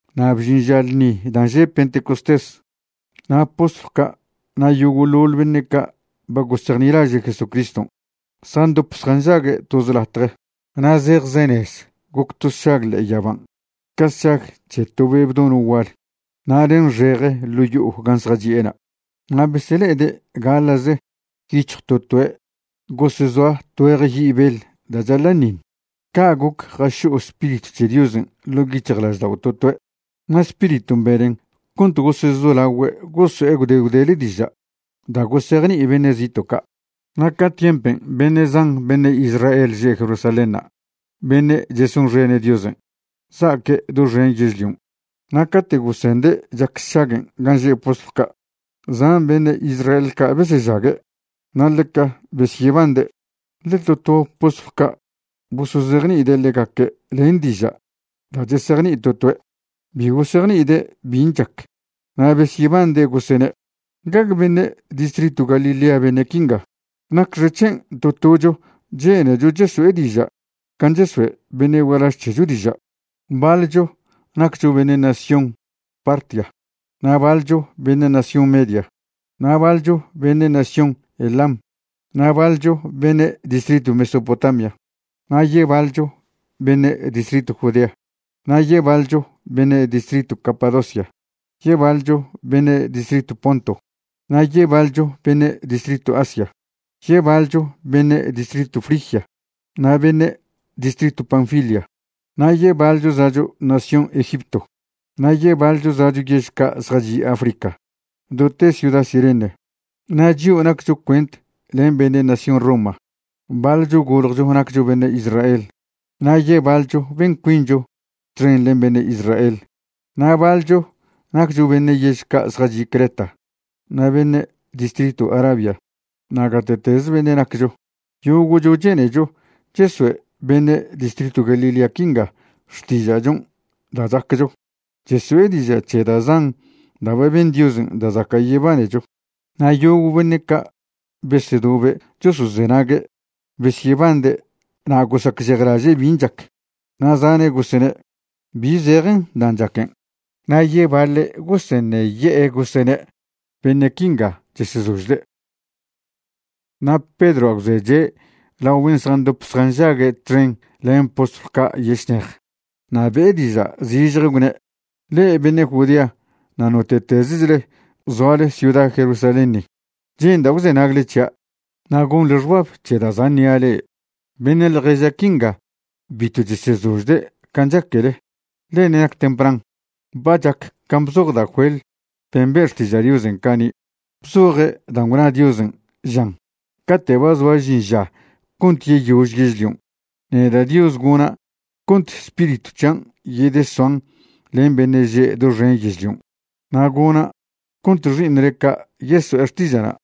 Na' bžin ža ḻṉi dan' že' Pentecostés, na' postlw ca' na' yogo'ḻoḻ beṉe' ca' ba gosejnilaže' Jesúcriston' zjandop zjanžague' toze latje. Na' zejzenez goc to sšag ḻe'e yaban' ca sšag c̱he to be' bdono' gual na' nenxeje ḻo' yo'o gan' zjachi'ena'. Na' besele'ede' gaḻa'ze yic̱hj to toe' gosezoa tgüeje yi' beḻ da' chaḻa'ṉiṉ. Ca' goc jašo'o Spiritw c̱he Diosen' ḻo' yic̱hjlaždao' to toe', na' Spiriton' benen cont gosezolagüe' goso'e gwde gwdele diža' da' gosejni'i beṉe' zito' ca'. Na' ca tiempen' beṉe' zan beṉe' Israel že' Jerusalénṉa' beṉe' chesonxene' Diosen', za'aque' doxen yežlion'. Na' cate' gosende' chac sšaguen' gan' že' postlw ca', zan beṉe' Israel ca' besežague', na' ḻeca besyebande', ḻe to to postlw ca' bosozejni'ide' ḻegaque' len diža' da' chesejni'i to toe'. Bi gosejni'ide' bin' chac na' besyebande' gosene': ―¿Gague beṉe' distritw Galilea beṉe' quinga? ¿Nacxec̱hen' to tocho chenecho cheso'e diža' can' chesoe' beṉe' gualaž c̱hecho diža'? Baḻcho naccho beṉe' nación Partia, na' baḻcho beṉe' nación Media, na' baḻcho beṉe' nación Elam, na' baḻcho beṉe' distritw Mesopotamia. Na' yebaḻcho beṉe' distritw Judea, na' yebaḻcho beṉe' distritw Capadocia, yebaḻcho beṉe' distritw Ponto, na' yebaḻcho beṉe' distritw Asia, yebaḻcho beṉe' distritw Frigia na' beṉe' distritw Panfilia, na' yebaḻcho za'cho nación Egipto, na' yebaḻcho za'cho yež ca' zjachi' Africa do te ciuda Cirene. Na' chio' naccho cuent len beṉe' nación Roma, baḻcho goljcho naccho beṉe' Israel na' yebaḻcho ben cuincho txen len beṉe' Israel. Na' baḻcho naccho beṉe' yež ca' zjachi' Creta na' beṉe' distritw Arabia. Na' gate'tez beṉe' naccho, yogo'cho chenecho chesoe' beṉe' distritw Galilea quinga xtiža'chon' da' chaccho, cheso'e diža' c̱he da' zan da' ba ben Diosen' da' zaca' yebanecho. Na' yogo' beṉe' ca' besedobe' chosozenague' besyebande' na' gosacžejlaže' bin' chac, na' zane' gosene': ―¿Bi zejen dan' chaquen'? Na' yebaḻe' goseṉeye'e gosene': ―¡Beṉe' quinga chesezožde'! Na' Pedroa' gwzeche' lao ben' zjandop zjanžague' txen len postlw ca' yešnej na' be'e diža' zižje gwne': ―Le'e beṉe' Judea na' note'tezechle zoale ciuda Jerusalén ni, che'nda' gwzenagle c̱hia' na' gonḻe xbab c̱he da' za' ṉi'a le'e. Beṉe' ḻježa' quinga bitw chesezožde' can' chaquele, ḻe ṉe' nac tempran. Ba chac can' bzoj da' Joel ben' be' xtiža' Diosen' cani' bzoje' dan' gwna Diosen', žan: Cate' ba zoa žin ža cont yeyož yežlion', neda' Dios gona' cont Spiritw c̱hian' yedesoan len beṉe' že' doxen yežlion'. Na' gona' cont xi'iṉle ca' yeso'e xtiža'na',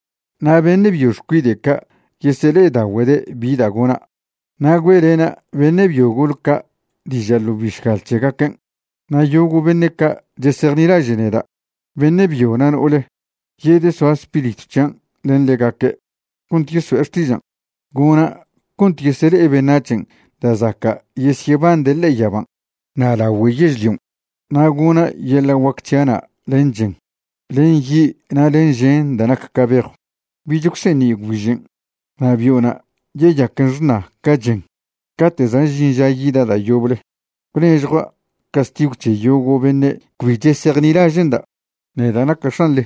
na' beṉe' byo xcuide' ca' yesele'edagüede' bi da' gona', na' güe'lena' beṉe' byo gol ca' diža' ḻo bišgal c̱hegaquen'. Na' yogo' beṉe' ca' chesejnilaže' neda', beṉe' byo na' no'ole, yedesoa Spiritw c̱hian' len ḻegaque' cont yeso'e xtižan'. Gona' cont yesele'e beṉac̱hen' da' zaca' yesyebande' ḻe'e yaban' na' lagüe yežlion', na' gona' yeḻa' guac c̱hia'na' len chen, len yi' na' len žen da' nac ca bejw. Bich gwseṉi' gwbižen', na' bio'na' yeyaquen xṉa ca chen cate' za' žin ža yida' da' yoble gwnežjua' castigw c̱he yogo' beṉe' cbi chesejnilaže'nda', neda' naca' X̱anḻe.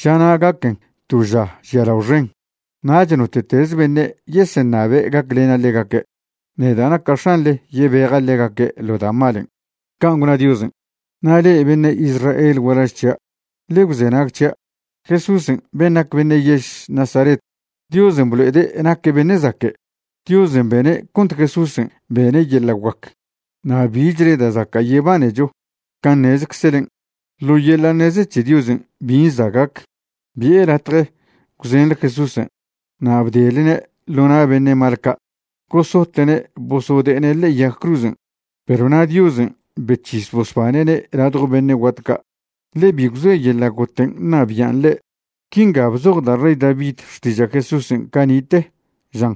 Žana' gaquen to ža žialao xen. Nach note'tez beṉe' yeseṉabe' gaclena' ḻegaque', neda' naca' X̱anḻe yebeja' ḻegaque' ḻo da' malen'. Can' gwna Diosen'. ’Na' le'e beṉe' Israel gualaž c̱hia', ḻe gwzenag c̱hia'. Jesúsen' ben' nac beṉe' yež Nazaret, Diosen' blo'ede' naque' beṉe' zaque'. Diosen' bene' cont Jesúsen' bene' yeḻa' guac na' bichle da' zaca' yebanecho can' ṉezeczelen'. Ḻo yeḻa' ṉeze c̱he Diosen' bin' za' gac, bi'e latje gwzenḻe Jesúsen' na' bdelene' ḻo na' beṉe' mal ca' gosote'ne' bosode'ene' ḻe'e yag cruzen'. Perw na' Diosen' bec̱his bosbane'ne' ladjo beṉe' guat ca', ḻe bi gwzoe yeḻa' goten' ṉabian' ḻe'. Quinga bzoj da' rey David xtiža' Jesúsen' cani'te, žan: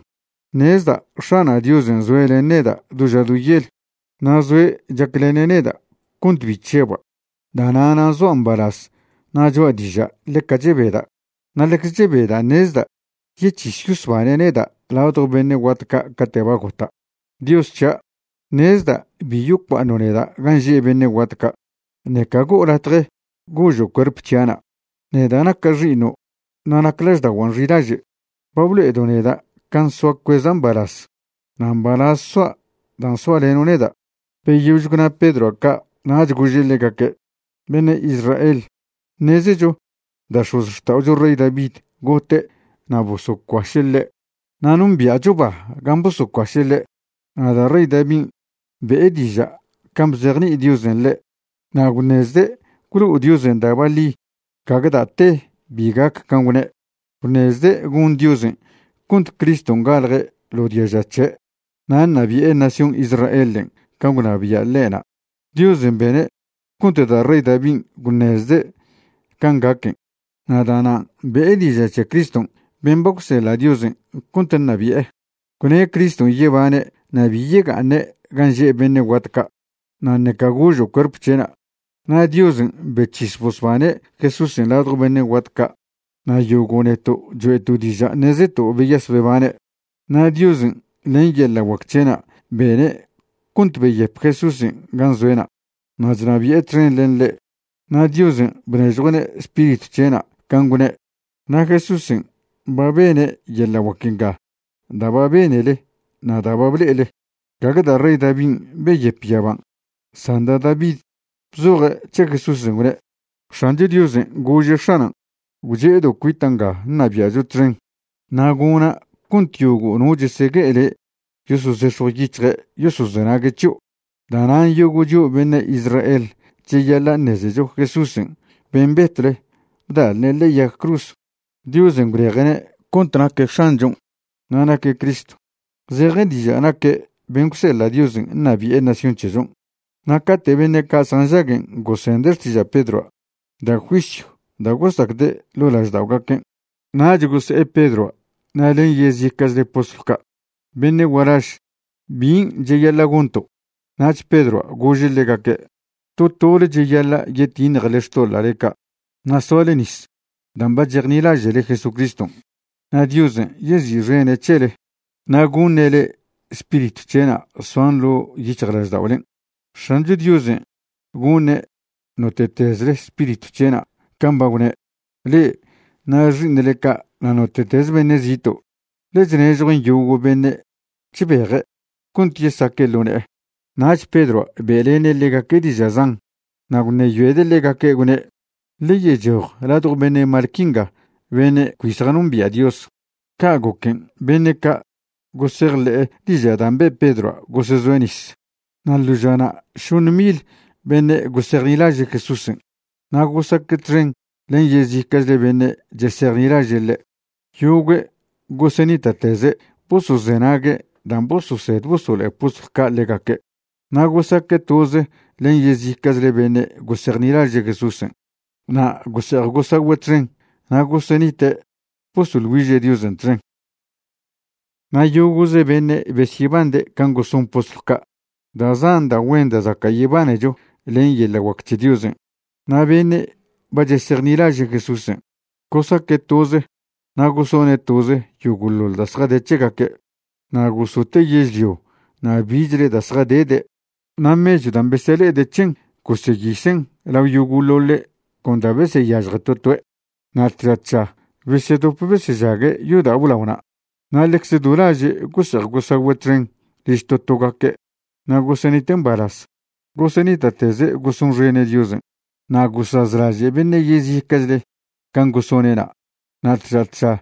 Ṉezda' X̱ana' Diosen' zoe' len neda' do ža do yel, na' zoe' chaclene' neda' cont bi chžeba'. Da'na'na' zoa' mbalaz na' choa' diža' ḻeca chebeda'. Na' ḻecze chebeda' ṉezda' yec̱his yosbane' neda' ladjo beṉe' guat ca' cate' ba gota'. Dios c̱hia', ṉezda' bi yocua'aṉo' neda' gan' že' beṉe' guat ca', ṉeca go'o latje gožo' cuerp c̱hia'na', neda' naca' xi'iṉo' na' nac lažda'oguan' xilaže'. Ba blo'edo' neda' can' soa cueza' mbalaz. na' mbalaz soa' dan' soaleno' neda'. Beyož gwna Pedroa' ca' nach gože' ḻegaque': ―Beṉe' Israel, ṉezecho da' x̱ozxta'ocho rey David gote' na' bosocuaše' ḻe'. Na' nombia'cho ba gan' bosocuaše' ḻe'. Na' da' rey Davin' be'e diža' can' bzejni'i Diosen' ḻe' na' gwṉezde' gwlo'o Diosen' da' baḻi gague da' te bi gac can' gwne'. Gwṉezde' gon Diosen' cont Criston' galje' ḻo diaža c̱he' na' ṉabi'e nación Israelen' can' gwnabia' ḻe'na'. Diosen' bene' cont da' rey Davin' gwṉezde' can' gaquen' na' da'nan' be'e diža' c̱he Criston' ben' ba gwseḻa' Diosen' cont ṉabi'e. Gwne' Criston' yebane' na' bi yega'aṉe' gan' že' beṉe' guat ca' na' ṉeca gožo' cuerp c̱he'na'. Na' Diosen' bec̱his bosbane' Jesúsen' ladjo beṉe' guat ca', na' yogo' neto' choe'to' diža' ṉezeto' beyas bebane'. Na' Diosen' len yeḻa' guac c̱he'na' bene' cont beyep Jesúsen' gan' zoe'na' na' chnabi'e txen len ḻe'. Na' Diosen' bnežjue'ne' Spiritw c̱he'na' can' gwne'. Na' Jesúsen' ba bene' yeḻa' guac nga da' ba benele na' da' ba ble'ele. Gague da' rey Davin' beyep yaban', san da' David bzoje' c̱he Jesúsen' gwne': X̱ancho Diosen' gože' X̱anan': “Gwche'edo' cuita' nga ṉabia'cho txen, na' gona' cont yogo' no chesegue'e le' yosozex̱jw yic̱hje' yosozenague' c̱hio'.” ’Da'nan' yogo' chio' beṉe' Israel cheyaḻa' ṉezecho Jesúsen' ben' betwle bda'lne' ḻe'e yag cruz, Diosen' gwleje'ne' cont naque' X̱anchon' na' naque' Cristo, zeje diža' naque' ben' gwseḻa' Diosen' ṉabi'e nación c̱hechon'. Na' cate' beṉe' ca' zjanžaguen' gosende' xtiža' Pedroa', da' juisyw da' gosacde' ḻo' lažda'ogaquen', nach gose'e Pedroa' na' len yezica'chle postlw ca': ―Beṉe' gualaž, ¿bin' cheyaḻa' gonto'? Nach Pedroa' gože' ḻegaque': ―To tole cheyaḻa' yetiṉjele xtoḻa'le ca' na' soale nis dan' ba chejnilaže'le Jesucriston', na' Diosen' yezi'xene' c̱hele na' goṉe' le'e Spiritw c̱he'na' soan ḻo' yic̱hjlažda'olen'. X̱ancho Diosen' goṉe' note'tezle Spiritw c̱he'na' can' ba gwne', le'e na' xi'iṉle ca' na' note'tez beṉe' zito', ḻe chnežjuen' yogo' beṉe' chbeje' cont yesaque' ḻo ne'e. Nach Pedroa' be'lene' ḻegaque' diža' zan, na' gwṉeyoede' ḻegaque' gwne': ―Ḻe yechoj ladjo beṉe' mal quinga beṉe' cbi zjanombia' Dios. Ca' goquen' beṉe' ca' gosejḻe'e diža' dan' be' Pedroa' gosezoe' nis. Na' ḻo žana' šoṉ mil beṉe' gosejnilaže' Jesúsen' na' gosaque' txen len yezica'chle beṉe' chesejnilaže' ḻe'. Yogüe' gosenita'teze' bosozenague' dan' bososed bosolo'e postlw ca' ḻegaque'. Na' gosaque' toze len yezica'chle beṉe' gosejnilaže' Jesúsen' na' gose'ej gosagüe' txen na' gosenite' bosoḻ güiže' Diosen' txen. Na' yogo'ze beṉe' besyebande' can' goson postlw ca' da' zan da' güen da' zaca' yebanecho len yeḻa' guac c̱he Diosen'. Na' beṉe' ba chesejnilaže' Jesúsen' gosaque' toze na' gosone' toze yogo'ḻoḻ da' zjade c̱hegaque'. Na' gosote' yežlio na' bichle da' zjadede' na' mechw dan' besele'ede' c̱hen goseyisen' lao yogo'ḻoḻe' con da' beseyažje to toe'. Na' tža tža besedop besežague' yodao' blaona' na' ḻecze do laže' gose'ej gosagüe' txen liž to togaque' na' gosenite' mbalaz. Gosenita'teze' gosonxene' Diosen'. Na' gosazlaže' beṉe' yezica'chle can' gosone'na'. Na' tža tža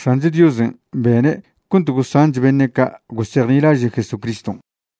X̱ancho Diosen' bene' cont gosanch beṉe' ca' gosejnilaže' Jesucriston'.